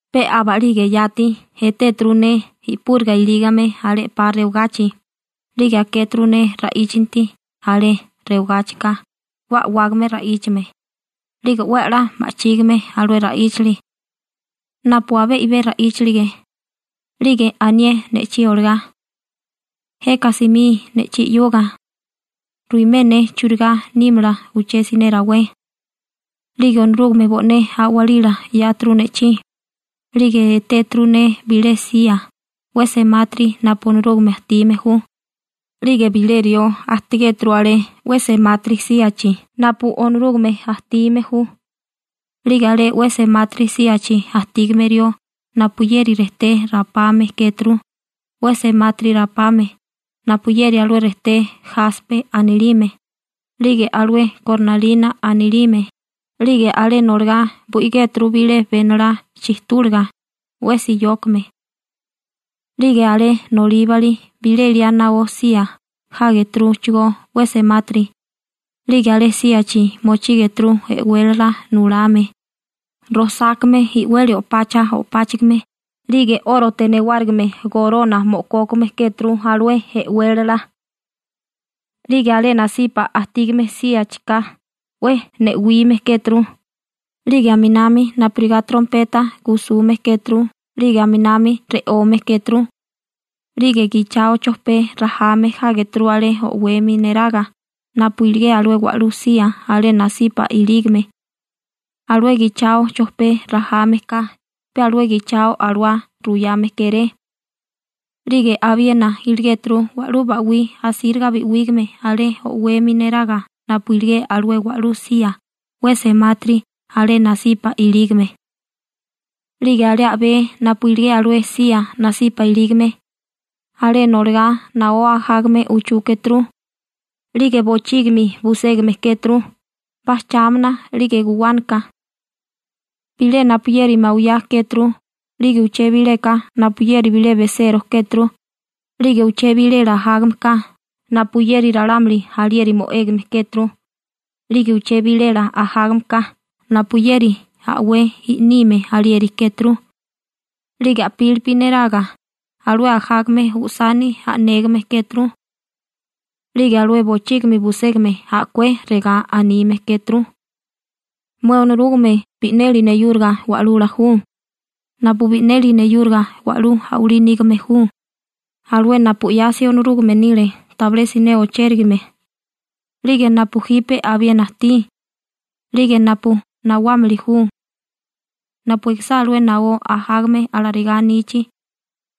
Pe aba'lige yati etéturu ne i'púriga ilígame alé 'pa rewagachi, 'lige akéturu ne ra'íchanti alé rewagáchika 'we a'wágame ra'íchame, 'lige 'we 'la ma'chígime alué ra'íchali napu abé i'bé ra'íchalige, 'lige anié ne'chí olagá: ―Jeka simí ne'chí 'yuga. Ruimé ne churigá nímala uché siné rawé. 'Lige Onorúgame bo'né a'walila 'yáturu ne'chí, 'lige etéturu ne bilé sía 'we semátiri napu Onorúgame ajtime ju 'lige bilé rió ajtigéturú alé 'we semátiri síachi napu Onorúgame ajtime ju. 'Lige alé 'we semátiri síachi ajtígame rió napuyeri rejté rapame kéturu, 'we semátiri rapame, napuyeri alué rejté jaspe anilime 'lige alué kornalina anilime, 'lige alé noligá bo'igéturu bilé benolá chijtúliga 'we siyókame. 'Lige alé nolíbali bilé liá naó sía jágeturuchigó 'we semátiri, 'lige alé síachi mochígeturu e'wélala nulame, rojsákame i'weli o'pacha o'páchigime 'lige 'órote newárigime gorona mo'kókame kéturu alué e'wélala. 'Lige alé nasipa ajtígame síachika 'we ne'wime kéturu 'lige aminami napurigá trompeta gusume kéturu 'lige aminami re'ome kéturu, 'lige gichao chojpé rajame jágeturu alé o'wemi neraga napu iligé alué wa'lú sía alé nasipa ilígame. Alué gichao chojpé rajame ka pe alué gichao alawá ruyame kéré. 'Lige abiena iligéturu wa'lú ba'wí asíriga bi'wígame alé o'wemi neraga napu iligé alué wa'lú sía 'we semátiri alé nasipa ilígame. 'Lige alé a'bé napu iligé alué sía nasipa ilígame, alé noligá naó ajágame uchú kéturu, 'lige bochígimi buségame kéturu, bajchámana 'lige guwánaka. Bilé napuyeri bilé mawiyá kéturu, 'lige uché bilélaka napuyeri bilé besero kéturu, 'lige uché bilela ajágameka napuyeri ralámuli alieri mo'égame kéturu, 'lige uché bilela ajágameka napuyeri a'wé i'nime alieri kéturu. 'Lige a'pílipi neraga alué ajágame usani a'négame kéturu. 'Lige alué bochígimi buségame a'kué regá anime kéturu: Mué Onorúgame bi'neli neyúriga Wa'lula ju napu bi'neli neyúriga wa'lú a'walí nígame ju, alué napu 'yasi Onorúgame nile tabilé siné ochérigame, 'lige napu jipe abiena ajtí, 'lige napu nawámili ju. Napu ekisá alué naó ajágame alarigá anichi,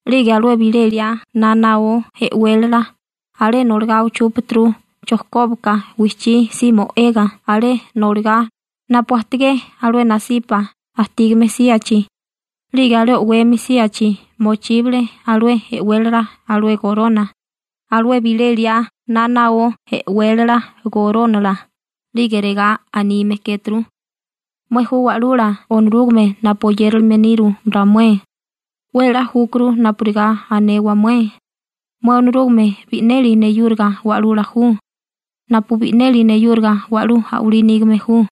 'lige alué bilé liá na naó e'wélala alé noligá uchúpaturu chojkóbaka wijchí si mo'ega alé noligá napu ajtigé alué nasipa ajtígame síachi, 'lige alé o'wemi síachi mochíbale alué e'wélala alué gorona, alué bilé liá na naó e'wélala gorónala, 'lige regá anime kéturu: Mué ju Wa'lula Onorúgame napu oyérilime niru ramué, 'we 'la júkuru napurigá anewa mué: «Mué Onorúgame bi'neli neyúriga Wa'lula ju napu bi'neli neyúriga wa'lú a'walí nígame ju,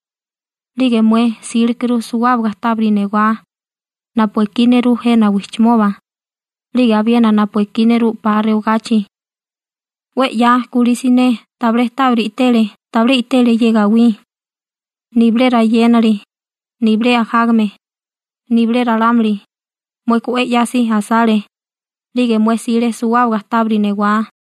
'lige mué sílekuru suwábaga tábiri newá napu ekí nerú jena wijchimoba 'lige abiena napu ekí nerú 'pa rewagachi. 'We 'ya kulí siné tabilé tábiri i'tele, tabilé i'tele ye gawí, nibilé rayénali, nibilé ajágame, nibilé ralámuli. Mueka 'we 'yasi asale, 'lige mué 'sile suwábaga tábiri newá.»